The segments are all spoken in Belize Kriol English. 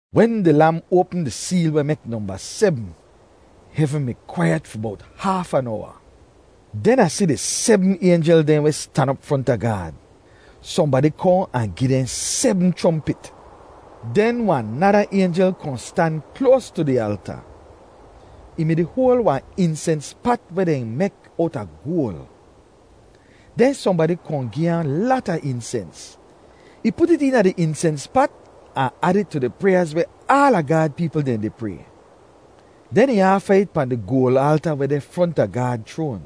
Wen di Lam oapm di seel weh mek nomba sebm, hevn mi kwaiyet fi bowt haaf an owa. Den Ah si di sebm aynjel dehn weh stan op fronta Gaad. Sohnbadi kohn ahn gi dehn sebm chrompit. Den wahn nada aynjel kohn stan kloas tu di alta. Ih mi-di hoal wahn insens pat weh dehn mek owta goal. Den sohnbadi kohn gi ahn lata insens. Ih put it eena di insens pat ahn ad it tu di pryaaz weh aala Gaad peepl dehn di pray. Den ih aafa it pahn di goal alta weh deh fronta Gaad chroan.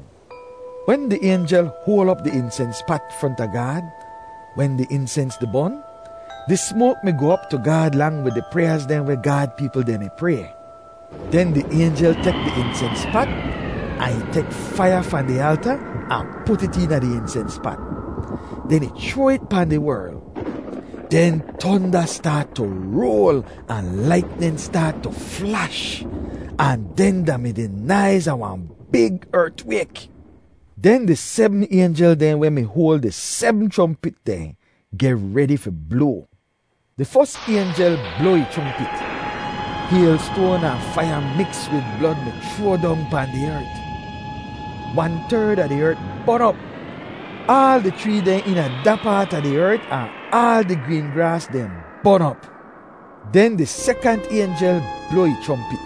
Wen di aynjel hoal op di insens pat fronta Gaad, wen di insens di bon, di smoak mi goh op tu Gaad lang wid di pryaaz dehn weh Gaad peepl dehn mi pray. Den di aynjel tek di insens pat ahn ih tek faiya fahn di alta ahn put it eena di insens pat. Den ih chroa it pahn di werl. Den tonda staat tu roal ahn laitnin staat tu flash, ahn den da mi di naiz a wahn big ertwayk. Den di sebm aynjel dehn weh mi hoal di sebm chrompit dehn geh redi fi bloa. Di fos aynjel bloa ih chrompit. Haylstoan ahn faiya miks wid blod mi chroa dong pahn di ert. Wan-terd a di ert bon op. Aal di chree dehn eena da paat a di ert ahn aal di green graas dehn bon op. Den di sekant aynjel bloa ih chrompit.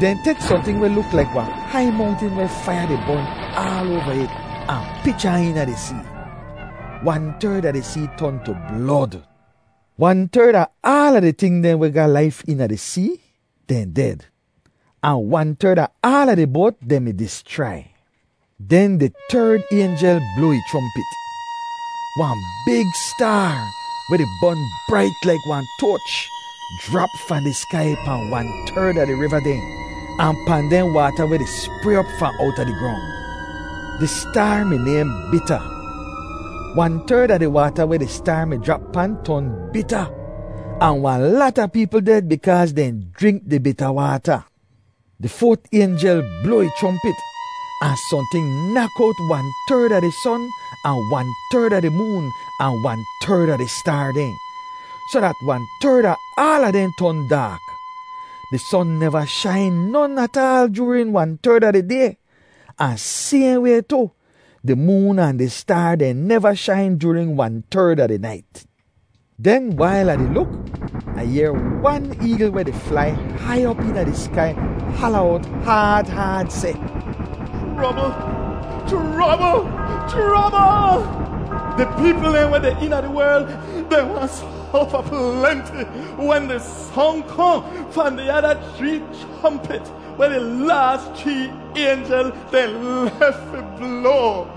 Dehn tek sohnting weh luk laik wahn hai mongtin weh faiya di bon aal oava it ahn pich ahn eena di see. Wan-terd a di see ton tu blod. Wan-terd a aal di ting dehn weh ga laif eena di see, dehn ded. Ahn wan-terd a aal di boat dehn mi dischrai. Den di terd aynjel bloa ih chrompit. Wahn big staar, weh di bon brait laik wahn toach, jrap fahn di skai pahn wan-terd a di riva dehn ahn pahn dehn waata weh di spray op fahn owta di grong. Di staar mi nayhn Bita. Wan-terd a di waata weh di staar mi jrap pan ton bita, ahn wahn lata peepl ded bikaaz dehn jrink di bita waata. Di foat aynjel bloa ih chrompit, ahn sohnting nak owt wan-terd a di son ahn wan-terd a di moon ahn wan-terd a di staar dehn, soh dat wan-terd a aala dehn ton daak. Di son neva shain non ataal joorin wan-terd a di day, ahn sayhn way tu, di moon ahn di staar dehn neva shain joorin wan-terd a di nait. Den wail Ah di luk, Ah yehr wan eegl weh di flai hai op eena di skai hala owt haad haad seh, “Chrobl! Chrobl! Chrobl! Di peepl dehn weh deh eena di werl, dehn wahn sofa plenti wen di song kohn fahn di ada chree chrompit weh di laas chree aynjel dehn lef fi bloa!”